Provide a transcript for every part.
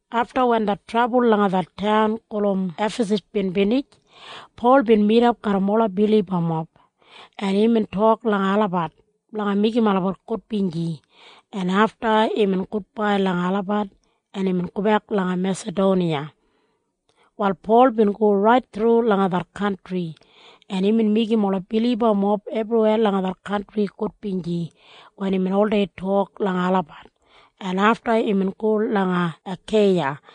Afta wen det trabul langa det taun gulum Efasas bin binij, Pol bin midap garram ola bilibamob, en imbin tok langa olabat blanga meigim olabat gudbinji, en afta imbin gudbai langa olabat, en imbin go langa Mesadoniya. Wal Pol bin go rait thru langa det kantri, en imbin meigim ola bilibamob ebriweya langa det kantri gudbinji wen imbin oldei tok langa olabat, en afta imbin go langa Akeiya,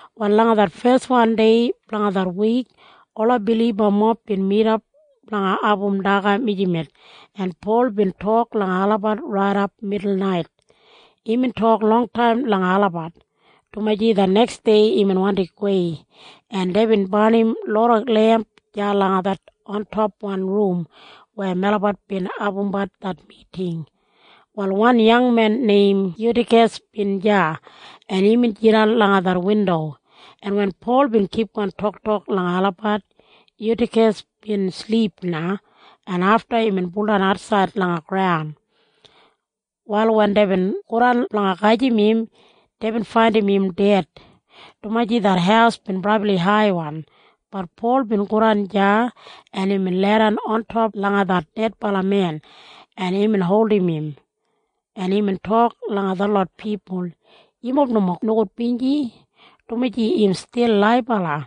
Wal langa det feswan dei blanga det wik, ola bilibamob bin midap blanga abum daga mijamet, en Pol bin tok langa olabat raidap midulnait. Imbin tok longtaim langa olabat, dumaji det neksdei imbin wandi gowei, en deibin barnim loda lemp deya langa det ontopwan rum weya melabat bin abumbat det miting. Wal wan yangmen neim Yutikas bin deya, en imbin jidan langa det windo, en wen Pol bin kipgon toktok langa olabat, Yutikas bin silip na, en afta imbin buldan atsaid langa graun. Wal wen deibin godan blanga gajim im, deibin faindim im ded, dumaji det haus bin brabli haiwan. Bat Pol bin godan deya, en imbin leidan ontop langa det dedbala men, en imbin holdim im, en imbin tok langa detlot pipul, “Yumob nomo nogudbinji, dumaji im stil laibala.”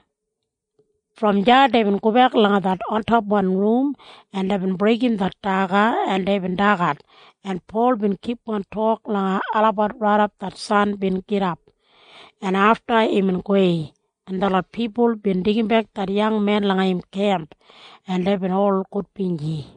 Brom deya deibin gobek langa det ontopwan rum, en deibin breigim det daga, en deibin dagat, en Pol bin kipgon tok langa olabat raidap det san bin gidap, en afta imbin gowei, en detlot pipul bin deigimbek det yangmen langa im kemp, en deibin ol gudbinji.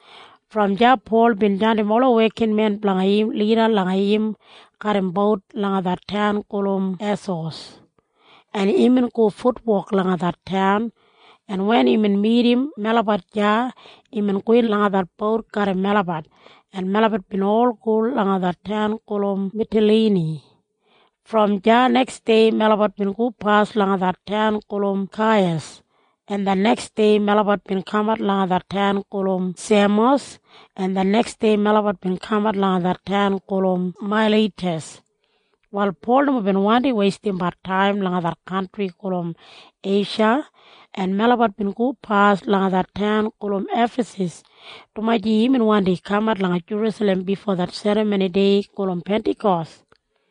Brom deya Pol bin jandim ola wekinmen blanga im lida langa im garram bout langa det taun gulum Esos, en imbin go futwok langa det taun, en wen imbin midim melabat deya, imbin gowin langa det bout garram melabat, en melabat bin ol go langa det taun gulum Mitalini. Brom deya neksdei melabat bin gopas langa det taun gulum Kaiyas, en det neksdei melabat bin kamat langa det taun gulum Semos, en det neksdei melabat bin kamat langa det taun gulum Mailitas. Wal Pol nomo bin wandi weistimbat taim langa det kantri gulum Eisha, en melabat bin gopas langa det taun gulum Efasas, dumaji imbin wandi kamat langa Jerusalem bifo det serramoni dei gulum Pentakos.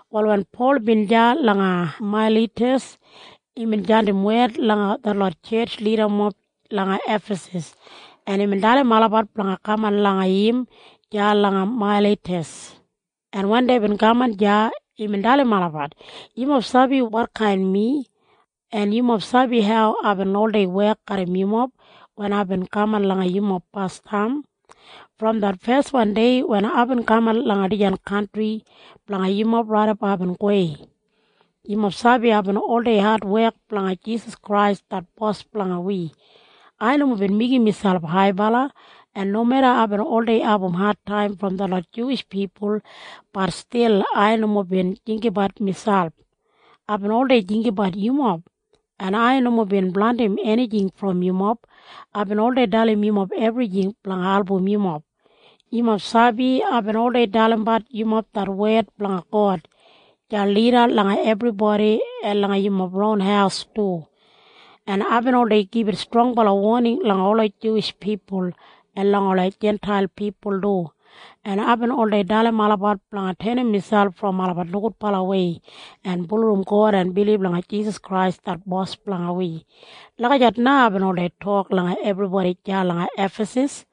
Wal wen Pol bin deya langa Mailitas, imbin jandim wed langa detlot tjetj lidamob langa Efasas, en imbin dalim olabat blanga kaman langa im deya langa Mailitas, en wen deibin kaman deya, imbin dalim olabat, “Yumob sabi wotkain mi, en yumob sabi hau aibin oldei wek garram yumob wen aibin kaman langa yumob basdam. Brom det feswan dei wen aibin kaman langa dijan kantri blanga yumob raidap aibin gowei, yumob sabi aibin oldei adwek blanga Jisas Krais det Bos blanga wi. Ai nomo bin meigim miselp haibala, en nomeda aibin oldei abumbat adtaim brom detlot Juwish pipul, bat stil ai nomo bin jinggabat miselp. Aibin oldei jinggabat yumob, en ai nomo bin blandim enijing brom yumob. Aibin oldei dalim yumob ebrijing blanga album yumob. Yumob sabi aibin oldei dalimbat yumob det wed blanga God deya lida langa ebribodi en langa yumob ron haus du, en aibin oldei gibit strongbala woning langa ola Juwish pipul en langa ola Jintail pipul du, en aibin oldei dalim olabat blanga tenim miselp brom olabat nogudbalawei en bulurrum God en bilib langa Jisas Krais det Bos blanga wi. Lagijat na aibin oldei tok langa ebribodi deya langa Efasas.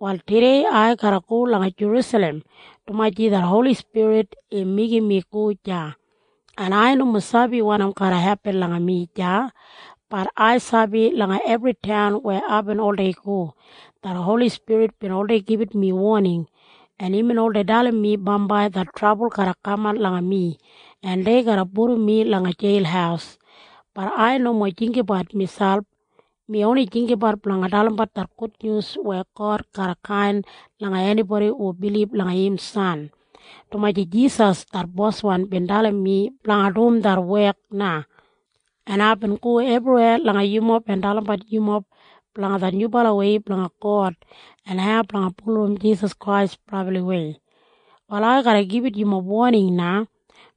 “Wal tudei ai garra go langa Jerusalem, dumaji det Holi Spirit im meigim mi go deya, en ai nomo sabi wanim garra hepin langa mi deya. Bat ai sabi langa ebri taun weya aibin oldei go, det Holi Spirit bin oldei gibit mi woning, en imbin oldei dalim mi bambai det trabul garra kaman langa mi en dei garra pudum mi langa jeil. Bat ai nomo jinggabat miselp. Mi oni jinggabat blanga dalimbat det gudnyus weya God garra kain langa enibodi hu bilib langa im san, dumaji Jisas det Boswan bin dalim mi blanga dum det wek na. En aibin go ebriweya langa yumob en dalimbat yumob blanga det nyubalawei blanga God en hau blanga bulurrum Jisas Krais brabliwei. “Wal ai garra gibit yumob woning na,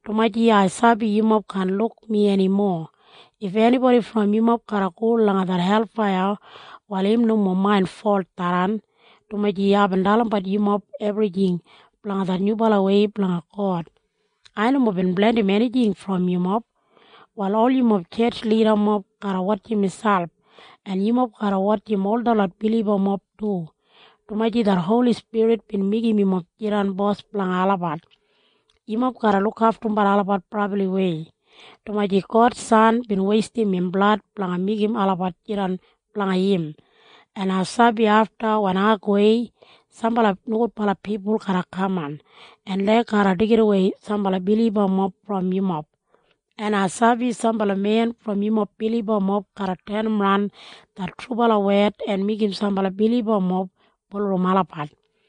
dumaji ai sabi yumob kaan luk mi enimo. If enibodi brom yumob garra go langa det helfaiya, wal im nomo main folt tharran, dumaji aibin dalimbat yumob ebrijing blanga det nyubalawei blanga God. Ai nomo bin blandim enijing brom yumob. “Wal ol yumob tjetj lidamob garra wotjim miselp, en yumob garra wotjim ol detlot bilibamob du, dumaji det Holi Spirit bin meigim yumob jidan bos blanga olabat. Yumob garra lukaftumbat olabat brabliwei, dumaji God san bin weistim im blad blanga meigim olabat jidan blanga im, en ai sabi afta wen ai gowei, sambala nogudbala pipul garra kaman, en dei garra deigidawei sambala bilibamob brom yumob. En ai sabi sambala men brom yumob bilibamob garra tenimran det trubala wed en meigim sambala bilibamob bulurrum olabat.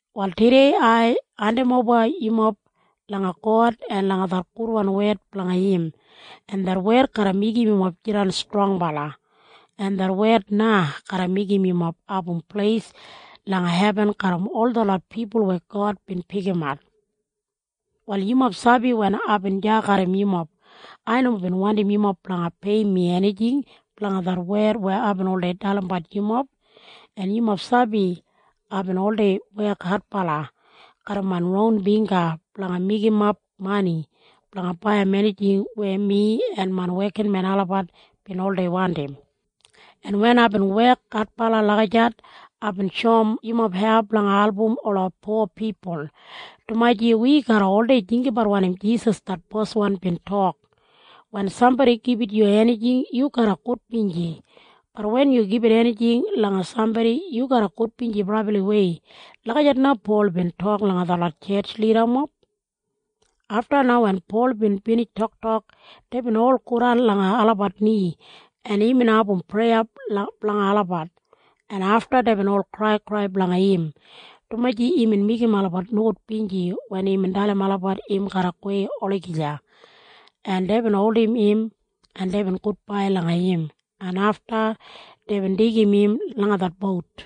“Wal tudei ai hendimoba yumob langa God en langa det gudwan wed blanga im, en det wed garra meigim yumob jidan strongbala, en det wed na garra meigim yumob abum pleis langa hebin garram ol detlot pipul weya God bin pikimat. “Wal yumob sabi wen aibin deya garram yumob, ai nomo bin wandim yumob blanga peiyim mi enijing blanga det wed weya aibin oldei dalimbat yumob. En yumob sabi aibin oldei wek adbala garram main ron bingga blanga meigimap mani blanga baiyim enijing weya mi en main wekinmen olabat bin oldei wandim. En wen aibin wek adbala lagijat, aibin shoum yumob hau blanga album ola po pipul, dumaji wi garra oldei jinggabat wanim Jisas det Boswan bin tok, ‘Wen sambodi gibit yu enijing, yu garra gudbinji. Bat wen yu gibit enijing langa sambodi, yu garra gudbinji brabliwei.’” Lagijat na Pol bin tok langa detlot tjetj lidamob. Afta na wen Pol bin binij toktok, deibin ol godan langa olabat ni, en imbin abum preya blanga olabat, en afta deibin ol kraikrai blanga im, dumaji imbin meigim olabat nogudbinji wen imbin dalim olabat im garra gowei olagija, en deibin holdim im, en deibin gudbai langa im, en afta deibin deigim im langa det bout.